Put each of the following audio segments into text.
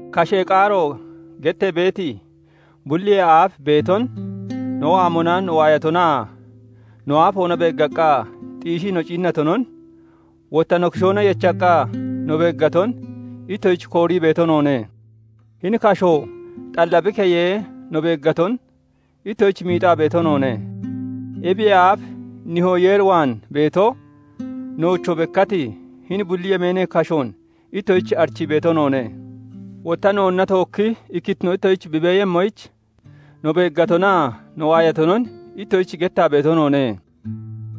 "Kashee Qaaro" gettee beeti, bulliyee aaf beeton, no waamona no waayatonaa no aafoona beeggaqqa xiishii no ciinnatonon, wotta no kishoona yechaqqa no beeggaton ittoshich koorii beeto noone. Hini kashoo xalla bi keyee no beeggaton ittoshich miixaa beeto noone; ebiyee aaf Nihoo Yeer waan beeto, noochoo bekkati hini bulli yemeenee kashoon ittoshich arichii beeto noone. Wotta noonna tookki ikkittino ittoshich bi beeyemmoyich, no beeggatonaa no waayatonon ittoshich gettaa beeto noone.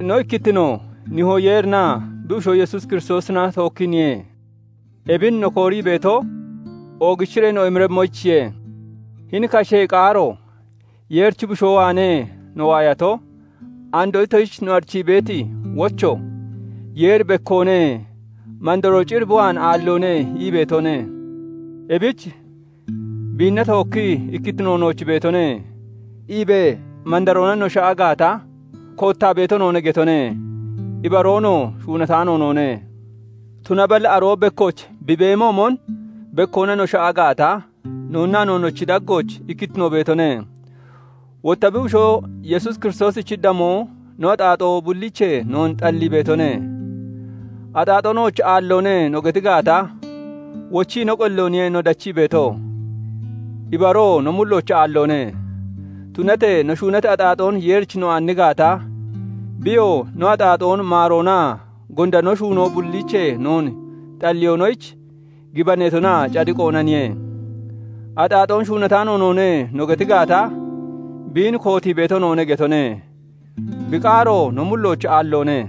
No ikkittinoo Nihoo Yeerinaa bi Bushoo Yesuus Kiristoosina tookkiiniye. Ebin no koorii beeto, oogichiree no emiremmoyichiye. Hini "Kashee Qaaro" Yeerichi Bushoo waanee no waayato, andoo ittoshich no arichii beeti wocho "Yeeri bekkoone; mandaroo cir bi waan aalloone" ii beetone. Ebich "Biinna tookkii ikkittino nooch beetone" iibee mandaroona no sha'a gaata, koottaa beeto noone getone; ibaroonoo shuunataano noone. Tunaballi aroo bekkooch bi beemoomon bekkoona no sha'a gaata, noonnaa noonnochi daggooch ikkittino beetone; wotta bi Bushoo Yesuus Kiristoosichi damoo no axaaxoo bulliichee noon xallii beetone. "Axaaxoo nooch aalloone" no geti gaata, wochii no qellooniye no dachii beeto; ibaroo no mullooch aalloone. Tunatee no shuunati axaaxoon Yeerich no aanni gaata, biyoo no axaaxoon maaroonaa gonda no shuunoo bulliichee noon xalliyoonoyich, gibaneetonaa cadiqoonaniye. "Axaaxoon shuunataano noone" no geti gaata, biin kootii beeto noone getone; bi qaaroo no mullooch aalloone.